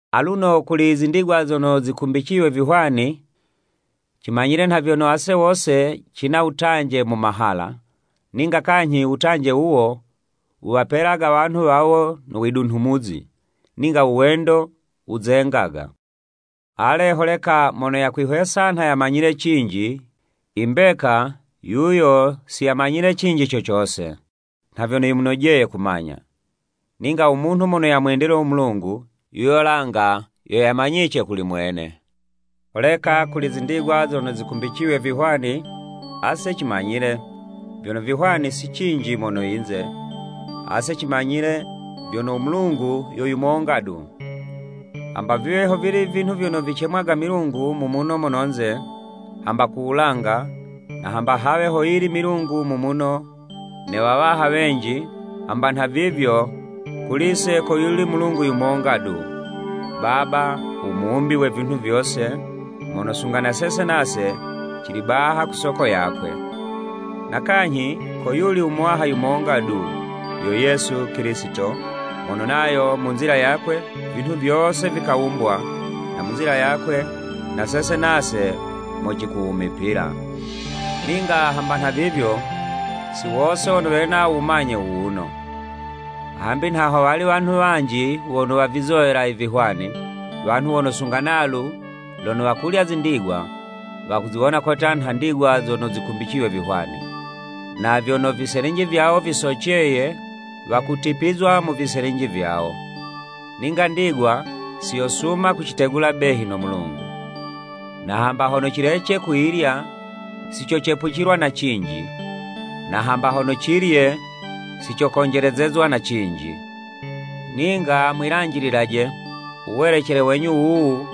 Aluno kuli i zindigwa zono zikumbiciywe vihwani, cimanyile nha vyono ase wose cina uwutanje mu mahala, ninga kanyhi u wutanje wuwo, wuwapelaga wanhu wawo no widunhumuzi, ninga u wendo, wuzengaga. Ale, holeka mono yakwihwesa nha yamanyile cinji, i mbeka, yuyo si yamanyile cinji co cose nha vyono yimunojeye kumanya. Ninga u munhu mono yamwendile u Mulungu, yuyo langa yo yamanyice kuli mwene. Holeka kuli i zindigwa zono zikumbiciywe vihwani, ase cimanyile, vyono vihwani si cinji mono yinze, ase cimanyile vyono u Mulungu yo yumonga du. Hamba viwe ho vili vinhu vyono vicemwaga milungu, mu muno mono'nze, hamba ku wulanga, na hamba hawe hoyili milungu mu muno, ne wawaha wenji, hamba nhavivyo, kuli'se koyuli Mulungu yumonga du, Baba, u Muwumbi we vinhu vyose, mono sunga na sese nase, cili baha ku soko yakwe. Na kanyhi, koyuli u Muwaha yumonga du, yo Yesu Kilisito, mono nayo mu nzila yakwe, vinhu vyose vikawumbwa, na mu nzila yakwe na sese nase mo cikuwumipila. Ninga hamba nhavivyo, si wose wono wena u wumanye wuwuno. Hambi nha howali wanhu wanji wono wavizowela i vihwani, wanhu wono sunga nalu, lono wakulya zindigwa, wakuziwona kotya nha ndigwa zono zikumbiciywe vihwani. Na vyono viselinji vyawo visoceye, wakutipizwa mu viselinji vyawo. Ninga ndigwa siyosuma kucitegula behi no Mulungu. Na hamba hono cilece kuyilya, si cocepucilwa na cinji, na hamba hono cilye, si cokonjelezezwa na cinji. Ninga mwilanjililaje, u welecele wenyu wuwu,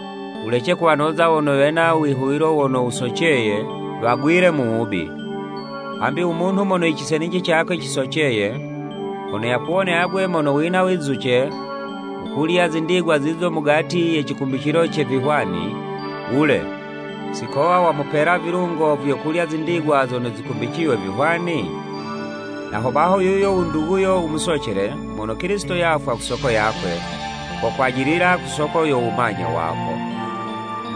wulece kuwanoza wono wena u wihuwilo wono wusoceye, wagwile mu wubi. Hambi u munhu mono i ciselinji cakwe cisoceye, hono yakuwone agwe mono wina wizuce wukulya zindigwa zizo mugati ye cikumbicilo ce vihwani, wule, si kowa wamupela vilungo vyo kulya zindigwa zono zikumbiciywe vihwani? Na hobaho yuyo u nduguyo u musocele, mono Kilisito yafwa ku soko yakwe, kokwajilila ku soko yo wumanye wako.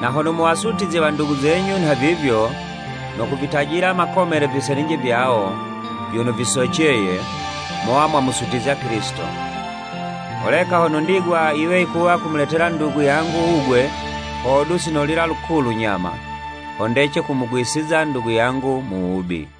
Na hono muwasutizye wandugu zenyu nhavivyo, no kuvitajila makomele viselinji vyawo, vyono visoceye, mowa mwamusutizya Kilisito. Holeka hono ndigwa yiwe yikuwa kumuletela ndugu yangu wugwe, hodu sinolila lukulu nyama, ho ndece kumugwisiza ndugu yangu mu wubi.